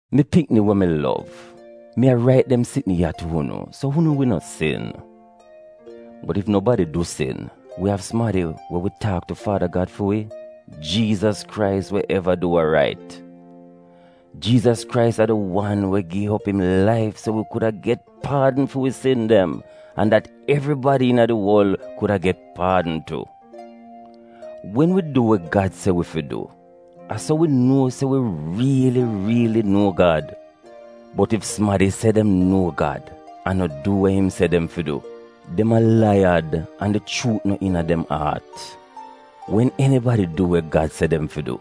Mi pikni we mi lov, mi a rait dem sitn ya tu unu so unu wi no sin. Bot ef nobadi du sin, wi av sumadi we wi taak tu Faada Gad fi wi, Jiizas Krais we eva du wa rait. Jiizas Krais a di wan we gi op im laif so wi kuda get paadn fi wi sin dem an dat evribadi iina di worl kuda get paadn tu. Wen wi du we Gad se wi fi du, a so wi nuo se wi riili riili nuo Gad. Bot ef sumadi se dem nuo Gad an no du we im se dem fi du, dem a laiyad an di chuut no iina dem aat. Wen enibadi du we Gad se dem fi du,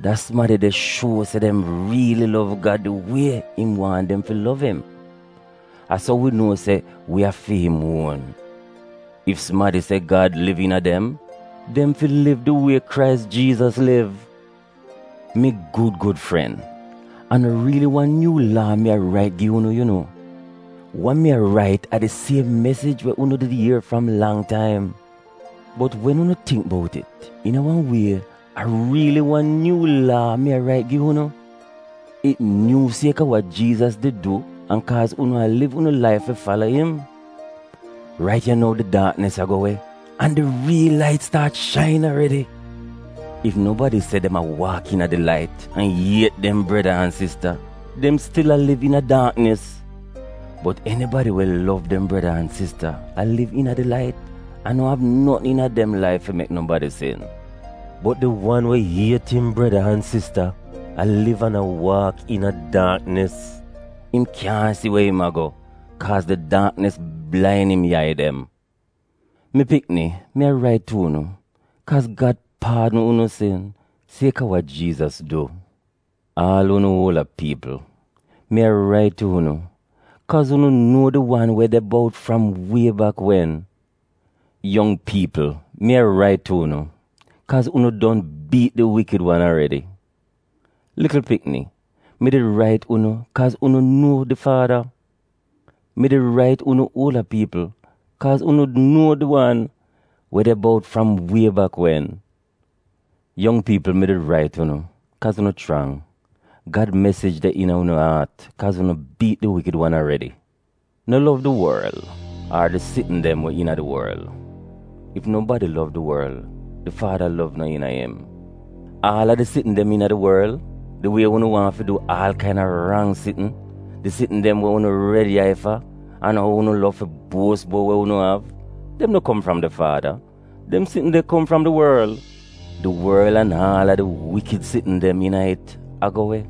da sumadi de shuo se dem riili lov Gad di wie im waahn dem fi lov im. A so wi nuo se wi a fi im uon. Ef sumadi se Gad liv iina dem, dem fi liv di wie Krais Jiizas liv. Mi gud gud fren, a no riili wan nyuu laa mi a rait gi unu yu no. Wa mi a rait a di siem mesij we unu did ier fram lang taim. Bot wen unu tingk bout it, iina wan wie, a riili wan nyuu laa mi a rait gi unu. It nyuu sieka wa Jiizas did du an kaaz unu a liv unu laif fi fala im. Rait ya nou di daaknis a go we, an di riil lait staat shain aredi. Ef nobadi se dem a waak iina di lait, an iet dem breda an sista; dem stil a liv iina daaknis. Bot enibadi we lov dem breda an sista a liv iina di lait an no av notn iina dem laif fi mek nobadi sin. Bot di wan we iet im breda an sista a liv an a waak iina daaknis; im kyaahn si we im a go, kaaz di daaknis blain im yai dem. Mi pikni mi a rait tu unu, kaaz Gad paadn unu sin sieka wa Jiizas du. Aal unu uolda piipl, mi a rait tu unu, kaaz unu nuo di wan we de bout fram wie bak wen. Yong piipl mi a rait tu unu, kaaz unu don biit di wikid wan aredi. Likl pikni, mi did rait unu, kaaz unu nuo di Faada. Mi did rait unu uolda piipl, kaaz unu nuo di wan we de bout fram wie bak wen. Yong piipl mi did rait unu, kaaz unu chrang. Gad mesij de iina unu aat, kaaz unu biit di Wikid wan aredi. No lov di worl ar di sitn dem we iina di worl. Ef nobadi lov di worl, di Faada lov no iina im. Aal a di sitn dem iina di worl: di wie unu waahn fi du aal kaina rang sitn, di sitn dem we unu red yai fa, an ou unu lov fi buos bout wa unu av — dem no kom fram di faada, dem sitn de kom fram di worl. Di worl an aal a di wikid sitn dem iina it a go we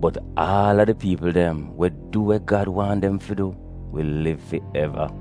bot aal a di piipl dem we du we Gad waahn dem fi du wi liv fi eva.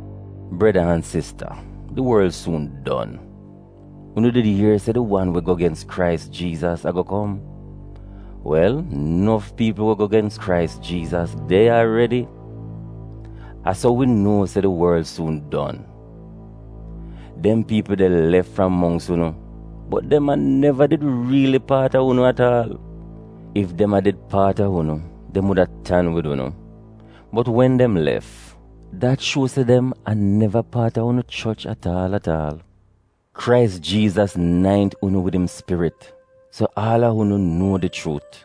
Breda an sista di worl suun don. Unu did ier se di wan we go gens Krais Jiizas ago kom. Wel nof piipl we go gens Krais Jiizas de ya aredi. A so wi nuo se di worl suun don. Dem piipl de lef fram mongks unu, bot dem a neva did riili paat a unu at aal. Ef dem a did paat a unu dem wuda tan wid unu. Bot wen dem lef, dat shuo se dem a neva paat a unu choch at aal at aal. Krais Jiizas naint unu wid im spirit, so aal a unu nuo di chuut.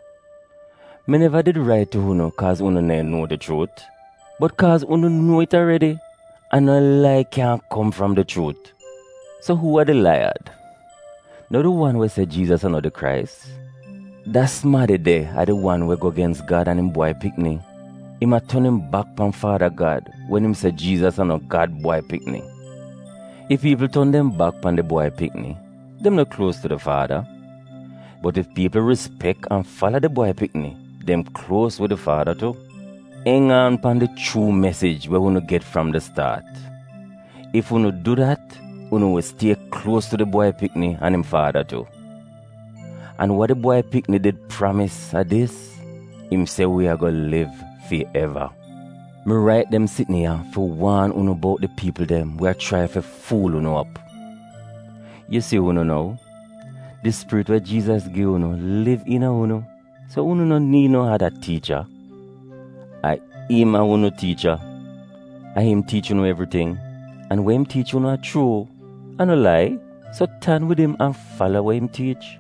Mi neva did rait tu unu kaaz unu neehn nuo di chuut, bot kaaz unu nuo it aredi, an no lai kyaahn kom fram di chuut. So uu a di laiyad? No di wan we se Jiizas a no di Krais. Da sumadi de a di wan we go gens Gad an im Bwai Pikni — im a ton im bak pan Faada Gad wen im se Jiizas a no Gad Bwai Pikni. Ef piipl ton dem bak pan di Bwai Pikni, dem no kluos tu di Faada. Bot ef piipl rispek an fala di Bwai Pikni, dem kluos wid di Faada tu. Eng aan pan di chuu mesij we unu get fram di staat. Ef unu du dat, unu wi stie kluos tu di Bwai Pikni an im Faada tu. An wa di Bwai Pikni did pramis a dis: im se wi ago liv fi eva. Mi rait dem sitn ya fi waan unu bout di piipl dem we a chrai fi fuul unu op. Yu si unu nou, di spirit we Jiizas gi unu liv iina unu, so unu no niid no ada tiicha. A im a unu tiicha. A im tiich unu evriting, an we im tiich unu a chuu — a no lai, so tan wid im an fala we im tiich.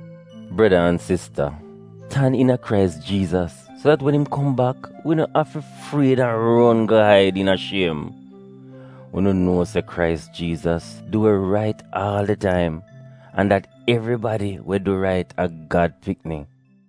Breda an sista, tan iina Krais Jiizas so dat wen im kom bak wi no afi fried an ron go aid iina shiem. Unu nuo se Krais Jiizas du we rait aal di taim, an dat evribadi we du rait a Gad pikni.